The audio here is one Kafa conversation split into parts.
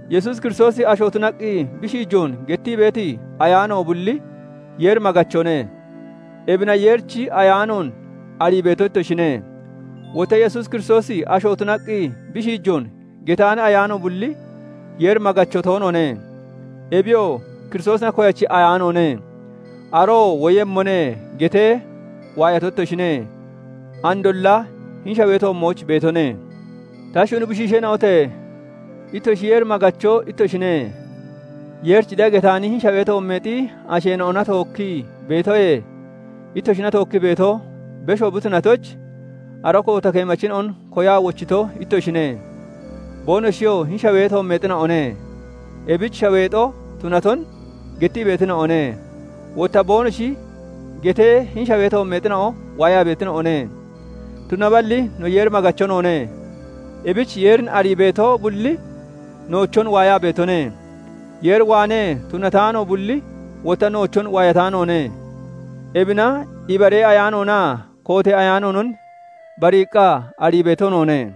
Yesuus Kiristoosi asho tunaqqi bi shiijoon gettii beeti ayaano bulli Yeer maggachone; ebina Yeerichi Ayaanoon arii beeto ittoshine. Wotta Yesuus Kiristoosi asho tunaqqi bi shiijoon getaani ayaano bulli Yeer maggacho toonoone. Ebiyoo Kiristoosina koyachi ayaanoone. Aroo "Woyemmone" getee waayato ittoshine; andolla hini shawee toommooch beetone. Ta shuni bushiisheena'ote! Ittoshi Yeer maggacho ittoshine; Yeerich de'a getaani hini shawee toommeexi asheena'ona tookkii beetoyee, ittoshina tookkii beeto besho bi tunatoyich, ara koota keemachina'on koyaa wochito ittoshine. Boonoshiyoo hini shawee toommeexina'one; ebich shaweexo tunaton gettii beetina'one; wotta boonoshi getee hini shawee toommeexina'o waayaa beetina'one. Tunaballi no Yeer maggacho noone; ebich Yeerin arii beeto bulli noochon waayaa beetone; Yeer waanee tunataano bulli wotta noochon waayataanoone. Ebina ibaree ayaanoonaa kootee ayaanoonon bariiqqa arii beeto noone.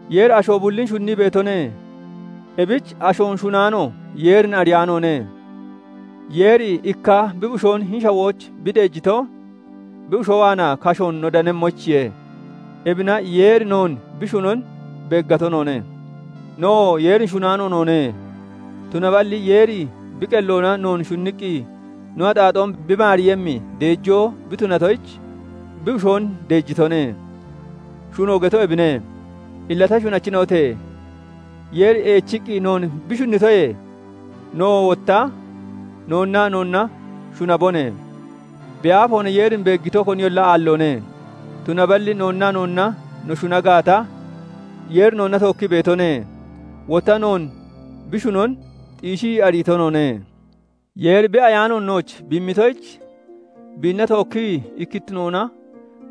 Yeeri asho bullin shunnii beetone; ebich ashoon shunaano Yeerin ariyaanoone. Yeeri ikka bi Bushoon hini shawooch bi deejito, bi Bushoo waanaa kashoon no danemmoyichiye. Ebina Yeeri noon bi shunon beeggato noone. Nowoo Yeerin shunaano noone; tunaballi Yeeri bi qelloona noon shunniqqi no axaaxoon bi maaremmi deejoo bi tunatoyich, bi Bushoon deejitone; shuno getoo ebine. Illa ta shunachina'ote! Yeeri eechiqqi noon bi shunnitoyee, nowoo wotta noonnaa noonna shunabone. Bi aafoona Yeerin beeggito koniyolla aalloone; tunaballi noonnaa noonna no shuna gaata, Yeeri noonna tookkii beetone; wotta noon bi shunon xiishii ariito noone. Yeeri bi Ayaanoon nooch bi immitoyich, biinna tookkii ikkittinoona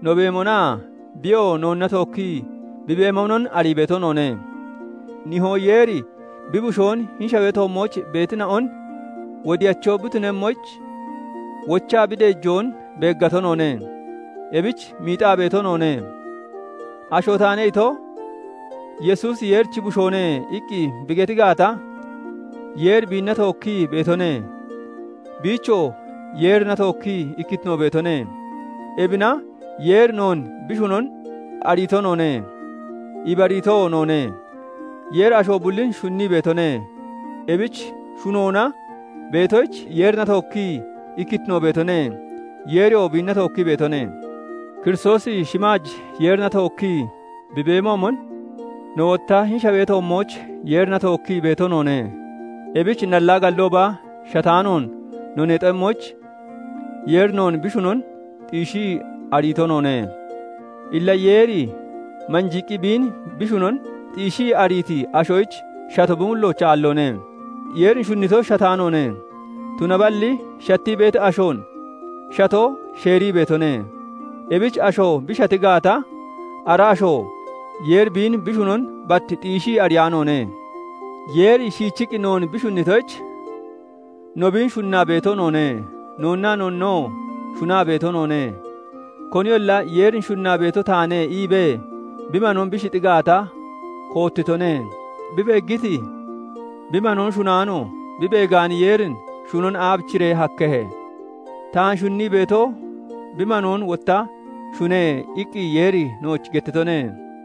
no beemonaa biyoo noonna tookkii bi beemonon arii beeto noone. Nihoo Yeeri bi Bushoon hini shawee toommooch beetina'on Wodiyacho bi tunemmoyich wochaa bi deejoon beeggato noone; ebich miixaa beeto noone. "Asho taane" ito "Yesuusi Yeerichi Bushoone" iqqi bi geti gaata, Yeeri biinna tookkii beetone; biichoo Yeerina tookkii ikkittino beetone. Ebina Yeeri noon bi shunon ariito noone; ibariitoo noone. Yeeri asho bullin shunnii beetone; ebich shunoona beetoyich Yeerina tookkii ikkittino beetone; Yeeriyoo biinna tookkii beetone. Kiristoosi shimaaj Yeerina tookkii bi beemoomon, no wotta hini shawee toommooch Yeerina tookkii beeto noone. Ebich nallaa gallooba shataanoon no neexemmoyich, Yeeri noon bi shunon xiishii ariito noone. Illa Yeeri manjiiqqi biin bi shunon xiishii ariiti ashoyich shato bi mullooch aalloone; Yeeri shunnito shataanoone; tunaballi shattii beeti ashoon shato sheerii beetone. Ebich asho bi shati gaata, ara asho Yeeri biin bi shunon bat xiishii ariyaanoone. Yeeri shiichii noon bi shunnitoyich, no biin shunnaa beeto noone; noonnaa noonnoo shunaa beeto noone; Koniyolla "Yeerin shunnaa beeto taane" iibee bi manoon bi shixi gaata, koottitone; bi beeggiti bi manoon shunaano, bi beegaani Yeerin shunon aabichiree hakkehe? "Taan shunnii beeto bi manoon wotta shune" iqqi Yeeri nooch gettitone.